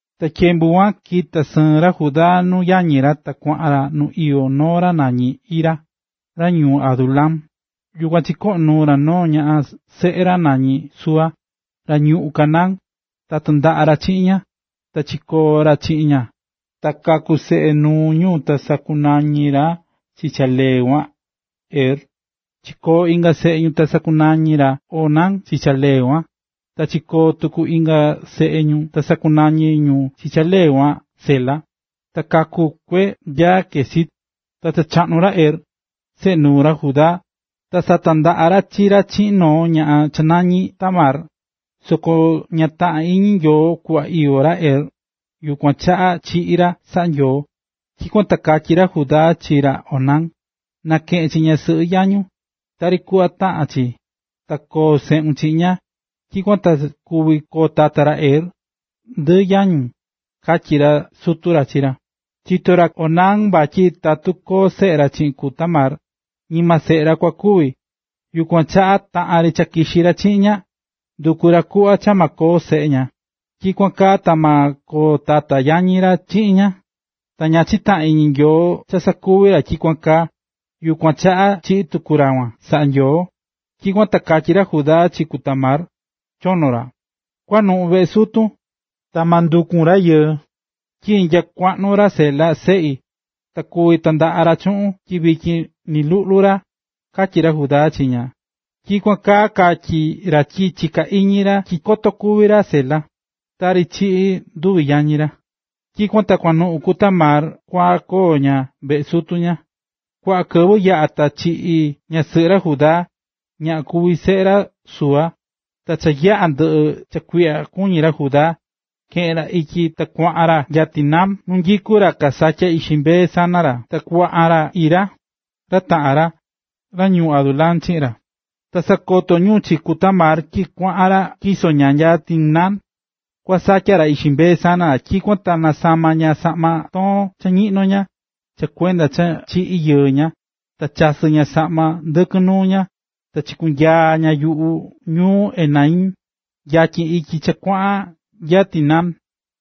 Ta tyembu kuan kita̱ sɨɨn ra Judá nuu yañi ra ta kuaꞌan ra nu iyó noo ra nañí Hira, ra ñuu Adulam. Yukuan chikoꞌo̱n nuu ra noo ñaꞌan seꞌe ra nañí Súa, ra ñuꞌún Canaán, ta tandaꞌa̱ ra chiꞌin ña, ta chikoo̱ ra chiꞌin ña. Ta kaku̱ seꞌe nuu ñu ta sakunañi̱ ra chi cha lee kuan, Er. Chikoo̱ inga seꞌe ñu ta sakunañi̱ ra Onán chi cha lee kuan. Ta chikoo̱ tuku inga seꞌe ñu, ta sakunañi̱ ñu chi cha lee kuan, Sela, ta kaku̱ kue nya Quezib. Ta cha chaꞌnu̱ ra Er, seꞌe nuu ra Judá, ta satandaꞌa̱ ra chi ra chiꞌin noo ñaꞌan cha nañí Tamar. Soko ña taꞌa̱n iñi Nyoo kuꞌva iyó ra Er, yukuan chaꞌa chiꞌi̱ ra saꞌa̱ Nyoo. Tyikuan ta katyí ra Judá chi ra Onán: ―Na̱keꞌen chi ñasɨꞌɨ yañun, tari kuꞌva taꞌán chi, ta koo seꞌun chiꞌin ña. Tyikuan ta kuvi koo tata ra Er, ndɨ yañun ―katyí sutu ra chi ra. Chitó ra Onán vatyi tatu koo seꞌe ra chiꞌin ku Tamar, ñima seꞌe ra kua kuvi, yukuan chaꞌa taꞌan ri cha kixí ra chiꞌin ña, ndukú ra kuꞌva cha ma koo seꞌe ña, tyikuan kaa ta ma koo tata yañi ra chiꞌin ña. Ta ña chitaꞌa̱n iñi Nyoo cha sakuvi̱ ra tyikuan kaa, yukuan chaꞌa chiꞌi̱ tuku ra kuan, saꞌa̱ Nyoo. Tyikuan ta katyí ra Judá chi ku Tamar, chono ra: ―Kua̱nuꞌun veꞌe sutun, ta ma ndukun rayɨɨ, tyi nya kuaꞌnu ra Sela, seꞌi, ta kuvi tandaꞌa ra chuꞌun tyi vityin ni luꞌlu ra ―katyí ra Judá chi ña. Tyikuan kaa katyi̱ ra tyi chiká iñi ra tyi koto kúvi ra Sela, tari chiꞌi̱ nduvi yañi ra. Tyikuan ta kuanuꞌun ku Tamar kua koo ña veꞌe sutu ña. Kuaꞌa kɨvɨ yaꞌa̱ ta chiꞌi̱ ñasɨꞌɨ ra Judá, ñaꞌan kuví seꞌe ra Súa. Ta cha yaꞌa̱ ndɨꞌɨ̱ cha kuiꞌya kuñí ra Judá, keꞌe̱n ra ityi ta kuaꞌan ra nya Timnat nu nyikú ra kasatyá ixi mbee sana ra, ta kuaꞌan ra Hira, ra taꞌan ra, ra ñuu Adulam, chiꞌin ra. Ta sakoto̱ ñu chi ku Tamar tyi kuaꞌan ra tyiso ña nya Timnat kua satya ra ixi mbee sana ra, tyikuan ta nasama̱ ña saꞌma toon cha ñiꞌno ña, cha kuenda cha chiꞌi̱ yɨɨ ña, ta chasɨ̱ ña saꞌma ndɨkɨn nuu ña, ta chikunyaa̱ ña yuꞌu ñuu Enaim, yatyin ityi cha kuaꞌan nya Timnat.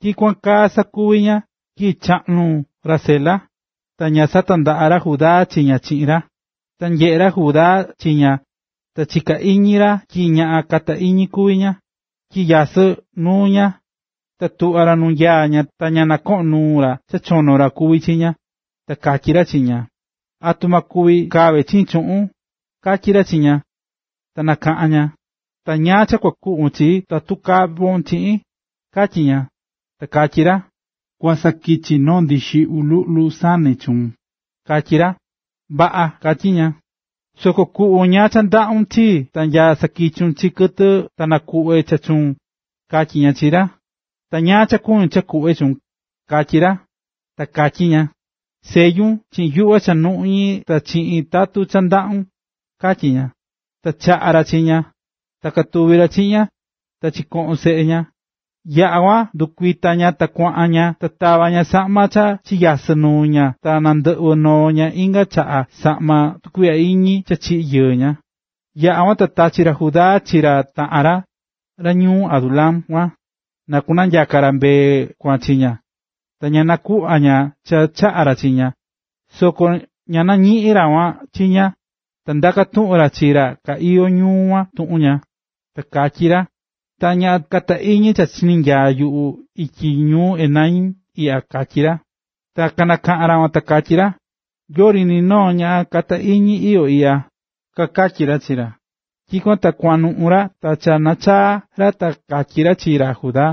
Tyikuan kaa sakuvi̱ ña tyi cha chaꞌnu̱ ra Sela, ta ña satandaꞌa̱ ra Judá chi ña chiꞌin ra. Ta nyeꞌe̱ ra Judá chi ña, ta chika̱ iñi ra tyi ñaꞌan kata iñi kuví ña, tyi nyasɨ́ nuu ña. Ta tuꞌva̱ ra nu nyaá ña ta ña nɨkoꞌo̱n nuu ra cha chono ra kuví chi ña, ta katyí ra chi ña: ―¿Atu ma kuvi kave chiin chuꞌun? ―katyí ra chi ña. Ta nakaꞌa̱n ña: ―Ta ¿ñáá cha kua kuꞌvon chii tatu kavon chiꞌin? ―katyí ña. Ta katyí ra: ―Kua sakichi noo ndixiꞌyu luꞌlu sane chuun ―katyí ra. ―Vaꞌa ―katyí ña―. Soko kuꞌvon ñáá cha ndaꞌún chii ta nya sakichun chi tɨ ta kunakuꞌve cha chuun ―katyí ña chi ra. ―Ta ¿ñáá cha kuñun cha kuꞌve chuun? ―katyí ra. Ta katyí ña: ―Selluna chiꞌin yuꞌva cha nuꞌñí ta chiꞌin tatun cha ndaꞌún ―katyí ña. Ta chaꞌa̱ ra chi ña, ta katuvi̱ ra chiꞌin ña, ta chikoꞌo̱n seꞌe ña. Yaꞌa̱ kuan ta ndɨkuita̱ ña ta kuaꞌan ña ta tava̱ ña saꞌma cha chinyasɨ̱ nuu ña ta nandɨꞌvɨ̱ noo ña inga chaꞌa saꞌma tukuiꞌya iñi cha chiꞌi̱ yɨɨ ña. Yaꞌa̱ kuan ta tachi̱ ra Judá chi ra taꞌan ra, ra ñuu Adulam kuan, na kunyaka ra mbee kuan chi ña, ta na nakuꞌva ña cha chaꞌa̱ ra chi ña, soko ña nañiꞌi̱n ra kuan chi ña. Ta ndaka̱ tuꞌun ra chi ra ka iyó ñuu kuan tuꞌun ña, ta katyí ra: ―¿Ta ñaꞌan kata iñi cha chinyaá yuꞌu ityi ñuu Enaim iꞌya? ―katyí ra. Ta kanakaꞌa̱n ra kuan ta kakatyí ra: ―Yori ni noo ñaꞌan kata iñi iyó iꞌya ―kakatyí ra chi ra. Tyikuan ta kuanuꞌu̱ ra ta cha nachaa̱ ra ta katyí ra chi ra Judá: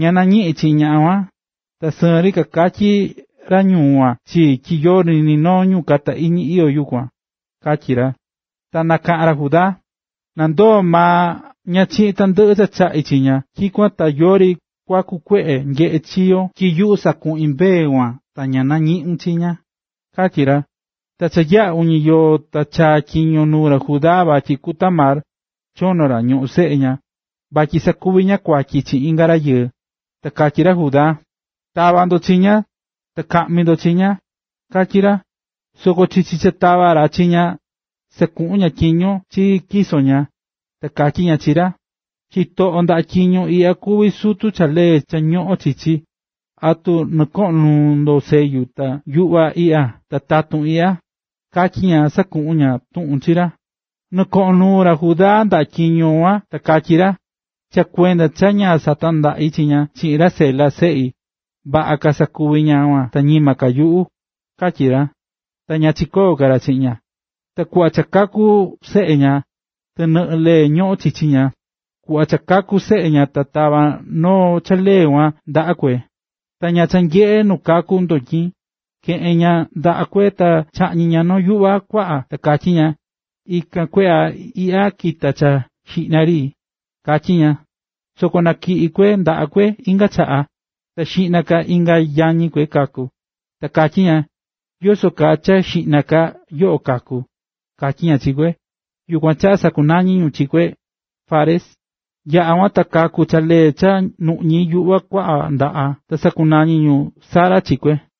―Ña nañiꞌi̱n chi ñaꞌan kuan, ta sɨɨn ri kakatyi̱ ra ñuu kuan chii tyi yori ni noo ñu kata iñi iyó kuan ―katyí ra. Ta nakaꞌa̱n ra Judá: ―Na ndoo maa ña chiꞌin tandɨꞌɨ cha chaꞌi̱ chi ña, tyikuan ta yori kuaku kueꞌe nyeꞌé chi yo, tyi yuꞌu sakuꞌi̱n mbee kuan ta ña nañiꞌu̱n chi ña ―katyí ra. Cha yaꞌa̱ uñi yoo, ta chaa̱ tyiño nuu ra Judá vatyi ku Tamar, chono ra, ñoꞌón seꞌe ña, vatyi sakuvi̱ ña kuatyi chiꞌin inga rayɨɨ. Ta katyí ra Judá: ―¡Ta̱va ndo chi ña, ta ka̱ꞌmi ndo chi ña! ―katyí ra. Soko chichi cha katavá ra chi ña, sakuꞌu̱n ña tyiño chi tyiso ña, ta katyí ña chi ra: “Chitoꞌo ndaꞌa tyiño iꞌya kuví sutu cha lee cha ñoꞌón chichi. ¿Atu nɨkoꞌo̱n nuun sellu ta yuꞌva iꞌya ta tatun iꞌya?”, katyí ña sakuꞌu̱n ña tuꞌun chi ra. Nɨkoꞌo̱n nuu ra Judá ndaꞌa tyiño kuan ta katyí ra: “Cha kuenda cha ña satandaꞌi̱ chi ña chiꞌin ra Sela, seꞌi. Vaꞌa ka sakuvi̱ ñaꞌan kuan ta ñima ka yuꞌu”, katyí ra. Ta ña chiyo̱ ka ra chiꞌin ña. Ta kuꞌva cha kua kaku seꞌe ña, tɨnɨꞌɨ lee ñoꞌón chichi ña. Kuꞌva cha kaku̱ seꞌe ña ta tava̱ noo cha lee kuan ndaꞌa kue, ta ñaꞌan cha nyeꞌé nu kakú ndotyin, keꞌe̱n ña ndaꞌa kue ta chaꞌñi̱ ña noo yuꞌva kuaꞌa, ta katyi̱ ña: “Ikan kue iꞌya kita̱ cha xiꞌna ri”, katyí ña. Soko natyiꞌi̱ kue ndaꞌa kue inga chaꞌa, ta xiꞌna ka inga yañi kue kaku̱. Ta katyi ña: “¿Yoso kaa cha xiꞌna ka yoꞌo kaku̱?”, katyí ña chi kue. Yukuan chaꞌa sakunañi̱ ñu chi lee kuan Fares. Yaꞌa̱ kuan ta kaku̱ cha lee cha nuꞌñí yuꞌva kuaꞌa ndaꞌa, ta sakunañi̱ ñu Zara chi kue.